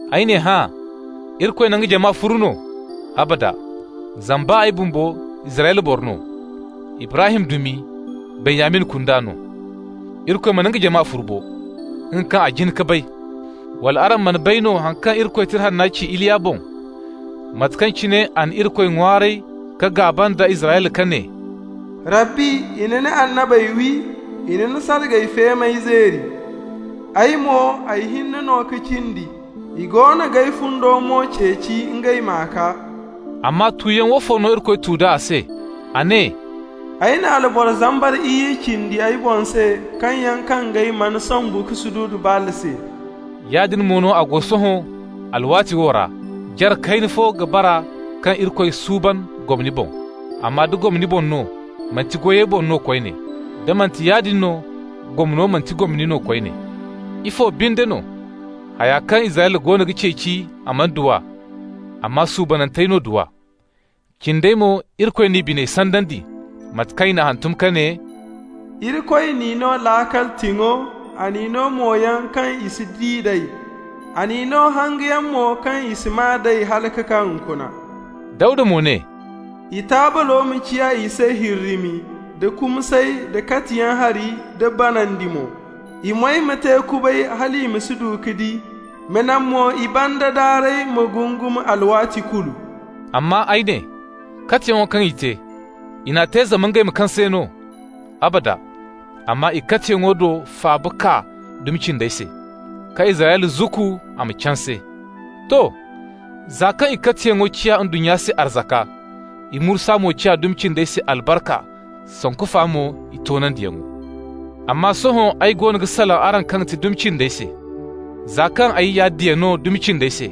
Ay ne hã: Irikoy na nga jama furu no? Abada! Zama baa ay bumbo Israyla boro no, Ibrahim dumi, Benyamin kunda no. Irikoy mana nga jama furu bo! nga kaŋ a jin ka bay. Wala araŋ mana bay no haŋ kaŋ Irikoy Tira Hanna ci Iliya boŋ, mate kaŋ cine a na Irikoy ŋwaaray ka gaaba nda Israyla, ka ne: «Rabbi, i na ni annabey wi, I na ni sargay feemey zeeri. Ay mo, ay hinne no ka cindi. I goono g'ay fundo mo ceeci, ngey m'a kaa.» Amma tuyaŋ woofo no Irikoy tu d'a a se? A ne: «Ay na alboro zambar iyye cindi ay boŋ se, kaŋ yaŋ kangey mana sombu ka sududu Baal se.» Yaadin mo no a go sohõ alwaati wo ra, jare kayna fo ka bara kaŋ Irikoy suuban gomni boŋ. Amma da gomni boŋ no, manti goyey boŋ no koyne. Da manti yaadin no, gomno manti gomni no koyne. Ifo binde no? Haya kaŋ Israyla goono ga ceeci, a mana du a, amma suubanantey no du a. Cindey mo Irikoy n'i biney sandandi. Mate kaŋ i n'a hantum, ka ne: «Irikoy n'i no laakal tiŋo. A n'i no moyaŋ kaŋ i si di nd'ey, A n'i no hangayaŋ mo kaŋ i si maa d'ey, hala ka kaa hunkuna.» Dawda mo ne: «I taablo ma ciya i se hirrimi, da kumsay, da katiyaŋ hari, da banandi mo. I moy ma te kubay, hal i ma si du ka di. Ma naŋ mo i banda daarey ma gungum alwaati kulu.» Amma ay ne: Katiyaŋo kaŋ i te, i n'a te zama ngey ma kaŋ se no? Abada! Amma i katiyaŋo do faaba kaa dumi cindey se, ka Israyla zukku a ma canse. To. Za kaŋ i katiyaŋo ciya ndunnya se arzaka, i mursa mo ciya dumi cindey se albarka, sanku fa mo i toonandiyaŋo. Amma sohõ ay goono ga salaŋ araŋ kaŋ ga ti dumi cindey se. Za kaŋ ay ya diya no dumi cindey se,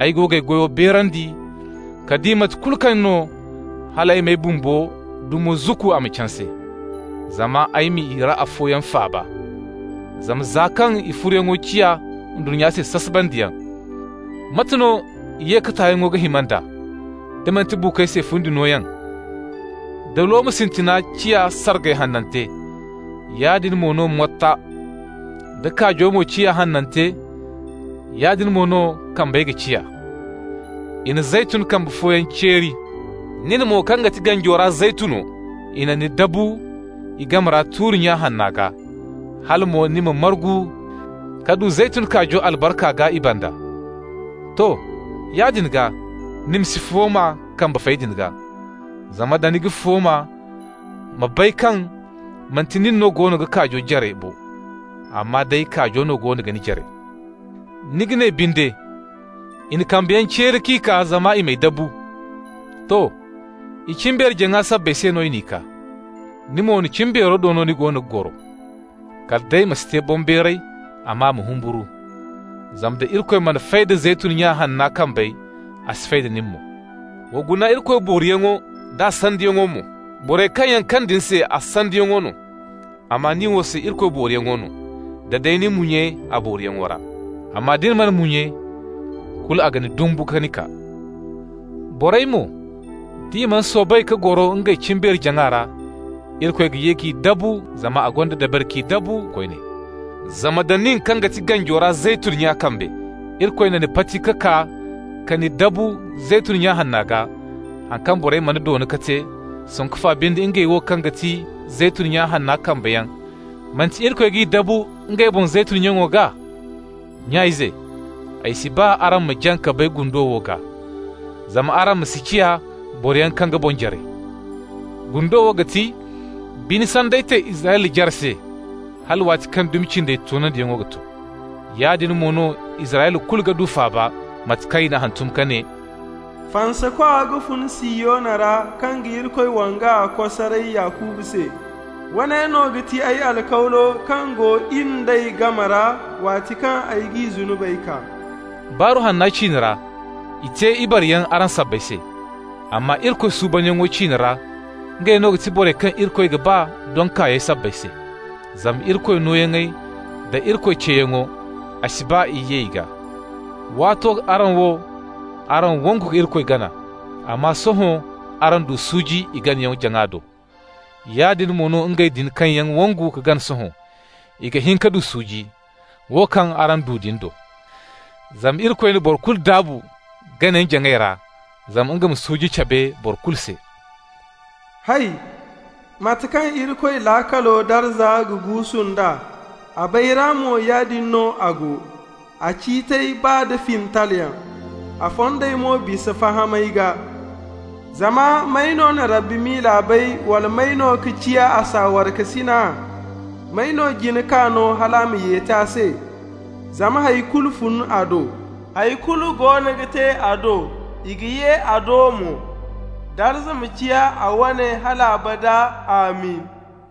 ay go g'ay goyo beerandi ka di, mate kulu kaŋ no, hal ay m'ay bumbo dumo zukku a ma canse, zama ay ma i ra afooyaŋ faaba. Zama za kaŋ i furuyaŋo ciya ndunnya se sasabandiyaŋ, mate no i ye ka tayaŋo ga hima nd'a, da manti buukoy se fundi nooyaŋ? Da looma sintina ciya sargay hanante, yaadin mo no motta. Da kaajo mo ciya hanante, yaadin mo no kambey ga ciya. I na zeytun kambe fooyaŋ ceeri. Nin mo, kaŋ ga ti ganjo ra zeytuno, i na ni dabu i game ra tuuri-nya hanna gaa, hala mo ni margu ka du zeytun kaajo albarka gaa i banda. To, yaadin gaa, ni ma si fooma kambe fey din gaa, zama nda ni ga fooma, ma bay kaŋ manti nin no goono ga kaajo jare bo, amma day kaajo no goono ga ni jare. Ni ga ne binde: «I na kambeyaŋ ceeri k'i kaa zama i m'ay dabu.» To, i cimbeeri-jaŋa sabbay se no i n'i kaa. Ni mo, ni cimbeero do no ni goono ga goro. Kala day ma si te boŋbeeray, amma ma humburu. Zama nda Irikoy mana fay da zeytun nya hanna kambey, a si fay da nin mo. Wa guna Irikoy booriyaŋo d'a sandiyaŋo mo. Borey kaŋ yaŋ kaŋ din se, a sandiyaŋo no, amma ni wo se Irikoy booriyaŋo no, da day ni munye a booriyaŋo ra. Amma da ni mana munye, kulu a ga ni dumbu ka ni kaa. Borey mo, d'i mana soobay ka goro ngey cimbeeri-jaŋa ra, Irikoy ga ye k'i dabu, zama a gonda dabari k'i dabu koyne. Zama nda nin, kaŋ ga ti ganjo ra zeytun nya kambe, Irikoy na ni pati ka kaa ka ni dabu zeytun nya hanna gaa, haŋ kaŋ borey mana doona ka te, sanku fa binde ngey wo, kaŋ ga ti zeytun nya hanna kambeyaŋ, manti Irikoy g'i dabu ngey boŋ zeytun nyaŋo gaa? Nya-ize, ay si ba araŋ ma jaŋ ka bay gundo wo gaa (zama araŋ ma si ciya boroyaŋ kaŋ ga boŋ jare). Gundo wo ga ti: bine sanday te Israyla jare se, hala waati kaŋ dumi cindey toonandiyaŋo ga to. Yaadin mo no Israyla kulu ga du faaba, mate kaŋ i n'a hantum ka ne: «Fansakwa ga fun Sihiyona ra kaŋ ga Irikoy wanga kosaray Yakuba se. Woone no ga ti ay alkawlo kaŋ go in d'ey game ra, waati kaŋ ay g'i zunubey kaa.» Baaru Hanna ciine ra, i te ibareyaŋ araŋ sabbay se. Amma Irikoy suubanyaŋo ciine ra, ngey no ga ti borey kaŋ Irikoy ga ba doŋ kaayey sabbay se. Zama Irikoy nooyaŋey da Irikoy ceeyaŋo, a si ba ye i gaa. Waato araŋ wo, araŋ wangu ka Irikoy gana, amma sohõ araŋ du suuji i ganayaŋ-jaŋa do. Yaadin mo no ngey din kaŋ yaŋ wangu ka gana sohõ, i ga hin ka du suuji, wo kaŋ araŋ du din do. Zama Irikoy na boro kulu daabu ganayaŋ-jaŋay ra, zama nga ma suuji cabe borey kulu se. Hay! Mate kaŋ Irikoy laakalo arzaka ga guusu nd'a! A bayra mo, yaadin no a go! A ciitey baa da fintalyaŋ. A fondey mo bisa fahamay gaa! Zama: «May no na Rabbi miila bay, Wala may no ka ciya a saawarekasina? May no jin k'a no, hal a m'a yeti a se?» Zama hay kulu fun a do, Hay kulu goono ga te a do, i ga ye a do mo. Darza ma ciya a wane hal abada! Amin!